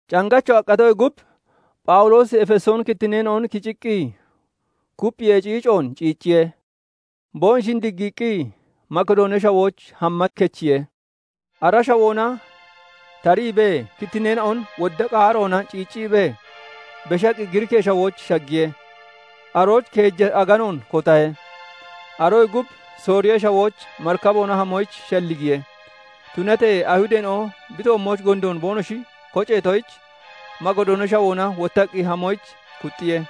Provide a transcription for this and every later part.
Cangacho aqqatoyee gub, Phawuloosi Efesooni kittinneena'on ceeggiqqi kupphiyee ciicoon ciicciye; boonoshin diggiiqqi Makidoonee Shawooch hamma kechiye. Ara shawoona tariibee, kittinneena'on wodda qaaroona ciicciibee, beshaqqi Giriikee Shawooch shaggiye. Arooch keeja aganoon kotahe; aroyee gub Sooriyee Shawooch marikaboona hamoyich shalligiye. Tunatee Ayihudeena'o bi toommooch gondoon boonoshi koceetoyich, Makidoonee Shawoona wottaqqi hamoyich kuxxiye.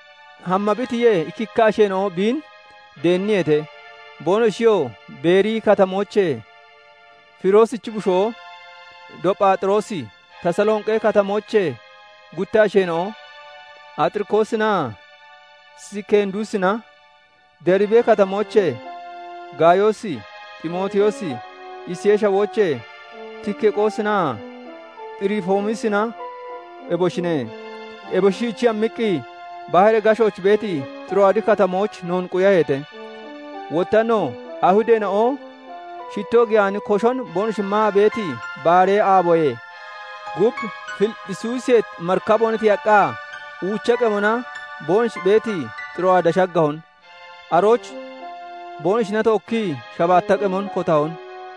Hamma bi tiyee, ikkikka asheena'o biin deenniyeete; boonoshiyoo Beeriyi Katamoochee Firoosichi bushoo Dophaaxiroosi, Tasalonqi Katamoochee gutta asheena'o Axiriqoosinaa Sikenduusina, Deribi Katamoochee Gaayoosi, Ximootiyoosi, Isiyee Shawoochee Tikiqoosinaa Xiroofimoosina eboshine. Eboshi shiichii hammiqqi, baharee gashooch beeti Xiro'aadi Katamooch noon quyaheete. Wotta no Ayihudeena'o shitoo giyaani koshon boonoshi maa beeti baaree aaboyee gub, Filipphisiyoosee marikaboona tiyaqqa, uucha qemona boonoshi beeti Xiro'aada shaggahon. Arooch boonoshina tookkii shabaatta qemon kotahon.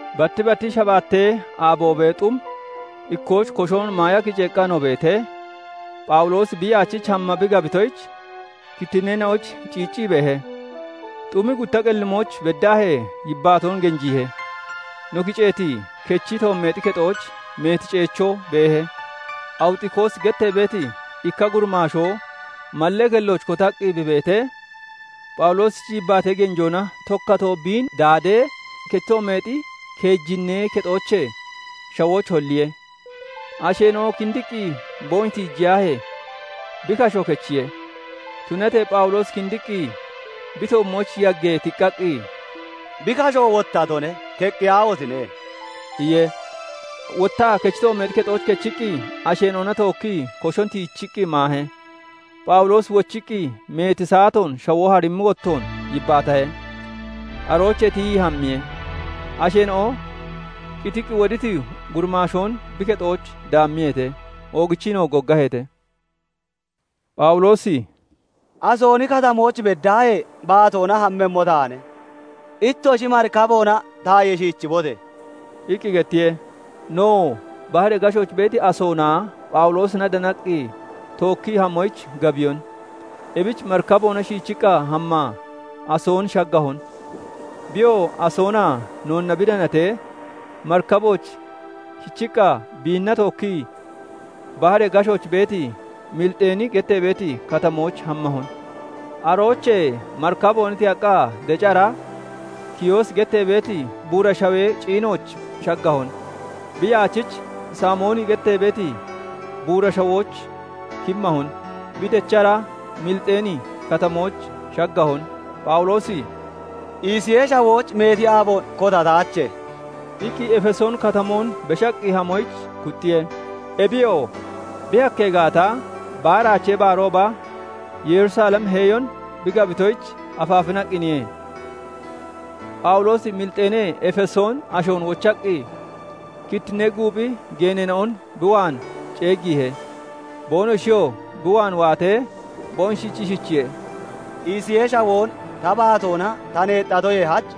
Batti batti shabaattee aaboobee xum ikkooch koshon maaya kiceeqqa no beetee, Phawuloosi bi yaachich hamma bi gabitoyich, kittinneena'oyich ciiccii beehe; xum gutta qellimooch beddaahee yibbaatoon genjiihe. No kiceeti kechi toommeexi kexooch meeti ceechoo beehe. Awuxikoosi gettee beeti ikka gurimaashoo malle kellooch kotaqqi bi beetee, Phawuloosichi yibbaatee genjoona tokkatoo biin daadiye; tokkatoo biin daadee, kechi toommeexi keejinnee kexoochee shawooch holliye; asheena'o kindiqqi boonoshi tiijiyaahee, bi kasho kechiye. Tunatee Phawuloosi kindiqqi, bi toommooch yaggee tiqqaqqi, "Bi kasho wottatone; keqqiyaahotine!" iye. Wottaa kechi toommeexi kexooch kechiqqi, asheena'ona tookkii koshon tiichiqqi maahe. Phawuloosi wochiqqi, meeti saatoon shawoo harimmi wottoon yibbaatahe; aroochee tiyii hammiye. Asheena'o qitiqqi woditi gurimaashoon bi kexooch daammiyeete; oogichiinoo goggaheete. Phawuloosi "Asooni Katamooch beddaahee baatoona hammemmo taane; ittoshi marikaboona tayee shiichibote!" iqqi gettiye. Nowoo baharee gashooch beeti Asoonaa Phawuloosina danaqqi tookkii hamoyich gabiyon. Ebich marikaboona shiichiqqa hammaa Asoon shaggahon. Biyoo Asoonaa noonna bi danatee, marikabooch kichiqqa biinna tookkii baharee gashooch beeti Mixiliini gettee beeti katamooch hammahon. Aroochee marikaboona tiyaqqa, deci hara Kiyoosi gettee beeti buura shawee ciinooch shaggahon. Bi yaachich Saamooni gettee beeti buura shawooch kimmahon. Bi dechara Milexiini Katamooch shaggahon. Phawuloosi "Isiyee Shawooch meeti aaboon kotataache" iqqi Efesooni Katamoon beshaqqi hamoyich kuxxiye. Ebiyoo bi hakkee gaata, Baaraachee Baarooba Yerusalem heeyon bi gabitoyich afaafinaqqiniye. Phawuloosi Milexiinee Efesoon ashoon wochaqqi, kittinnee guuphi geeneena'on bi waan ceeggiihe. Boonoshiyoo bi waan waatee, boonoshich ishichiye:- "Isiyee Shawoon ta baatoona ta neexxatoyee hach,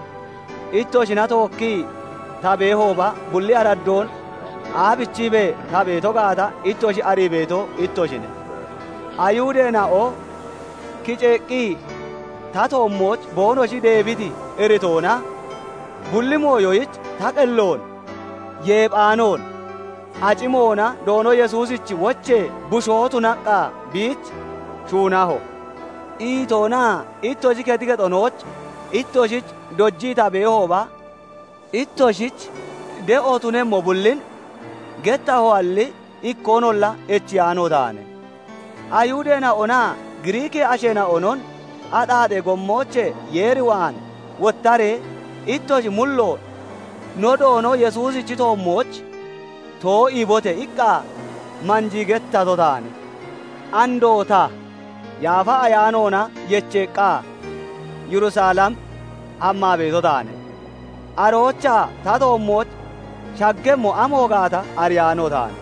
ittoshina tookkii ta beehooba bulli araddoon aabichiibee ta beeto gaata ittoshi arii beeto ittoshine; Ayihudeena'o kiceeqqi ta toommooch boonoshi deebiti iritoona, bulli mooyoyich ta qelloon yeephaanoon acimoona Doono Yesuusichi wochee bushoo tunaqqa biich shuunaho; iitoonaa ittoshi kexi kexonooch ittoshich dojii ta beehooba, ittoshich de'o tunemmo bullin gettahoalli ikkoonolla echiyaano taane. Ayihudeena'onaa Giriikee asheena'onon 'Axaaxee gommoochee Yeer waan wottaree ittoshi mulloon no Doono Yesuusichi toommooch to'iibote!' iqqa manjii gettato taane. "Andoo ta, Yaafa Ayaanoona yecheeqqa, Yerusalem hammaa beeto taane; aroochaa ta toommooch shaggemmo amo gaata ariyaano taane.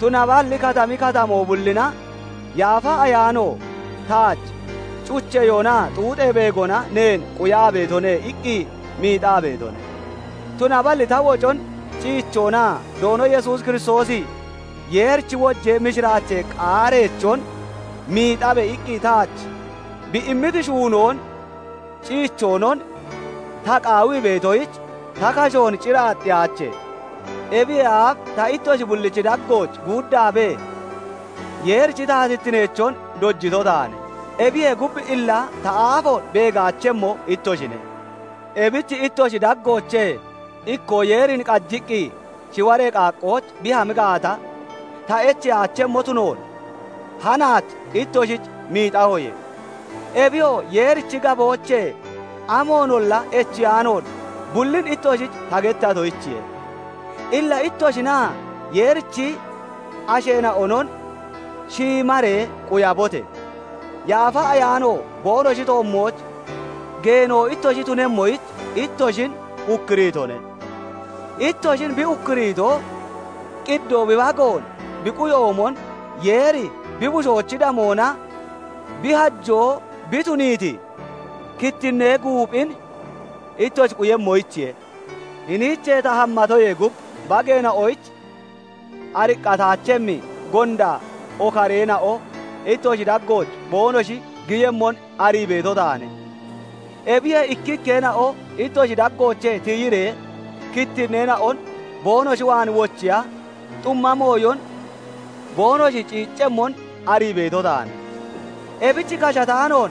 Tunaballi katami katoommo bullina Yaafa Ayaano taach 'Cucheyoonaa xuuxee beegona neen quyaa beetone' iqqi miixaa beetone. Tunaballi ta wocon ciichoonaa Doono Yesuus Kiristoosi 'Yeerichi wojee mishiraachee qaareechon miixabe!' iqqi taach bi immiti shuunoon ciichoonon ta qaawii beetoyich, ta kashoon cir aaxxiyaache. "Ebiyee aaf ta ittoshi bullichi daggooch guuddaabee, Yeerichi taatittineechon dojito taane; ebiyee gub illa ta aafoon beegaachemmo ittoshine. Ebich ittoshi daggoochee ikkoo Yeerin qajiqqi shiwaree qaaqqooch bi hami gaata, ta echeyaachemmo tunoon hanaach ittoshich miixahoye. Ebiyoo Yeerichi gaboochee amoonolla echiyaanoon bullin ittoshich ta gettatoyichiye. Illa ittoshinaa Yeerichi asheena'onon shiimaree quyabote! Yaafa Ayaano boonoshi toommooch geeno ittoshi tunemmoyich, ittoshin ukkuriitone; ittoshin bi ukkuriito, qiddoo bi bagoon bi quyoomon, Yeeri bi bushoochi damoona bi hajoo bi tuniiti kittinnee guuphin ittoshi quyemmoyichiye. Hiniichee ta hammatoyee gub, bageena'oyich ariqqataachemmi gonda okareena'o ittoshi daggooch boonoshi giyemmon arii beeto taane. Ebiyee ikkikkeena'o ittoshi daggoochee tiyiree, kittinneena'on boonoshi waan wochiya xumma mooyon boonoshi ciiccemmon arii beeto taane. Ebich kashataanoon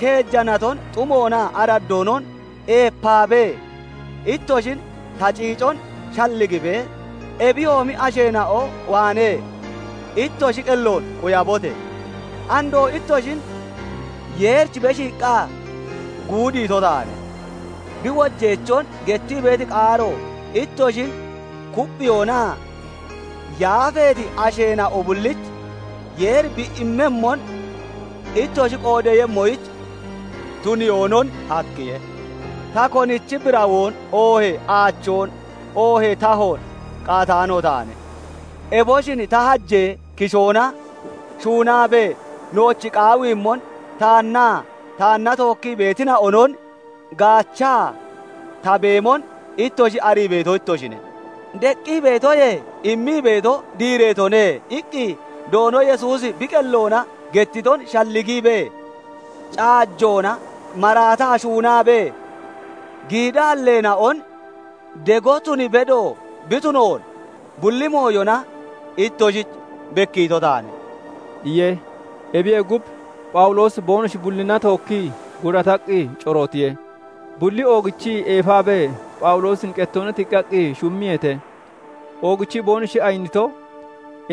keeja naton xumoonaa araddoonon eepaabee, ittoshin ta ciicon shalligibee, ebiyoomi asheena'o waanee ittoshi qelloon quyabote! "Andoo ittoshin Yeerich beshiiqqa guudiito taane; bi wojeechon gettii beeti qaaro ittoshin kupphiyoonaa yaafeeti asheena'o bullich Yeeri bi immemmon ittoshi qoodeeyemmoyich tuniyoonon hakkiye. Ta konichi birawoon, oohee aachoon, oohee tahoon qaataano taane; eboshin ta hajee kishoona shuunaabee nooch qaawiimmon taannaa taanna tookkii beetina'onon gaachaa ta beemon ittoshi arii beeto ittoshine. 'Deqqi beetoyee immii beeto diireetone' iqqi Doono Yesuusi bi qelloona gettiton shalligiibee, caajoona maraataa shuunaabee giidaalleena'on dego tun bedo bi tunoon bulli mooyona ittoshich bekkiito taane" iye. Ebiyee gub, Phawuloosi boonoshi bullina tookkii gurataqqi corootiye. Bulli oogichii eefaabee Phawuloosin qettoona tiqqaqqi shummiyeete; oogichii boonoshi ayinito,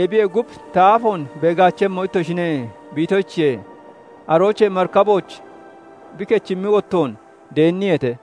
"Ebiyee gub ta aafoon beegaachemmo ittoshine" bi itoyichiye. Aroochee marikabooch bi kechimmi wottoon deenniyeete.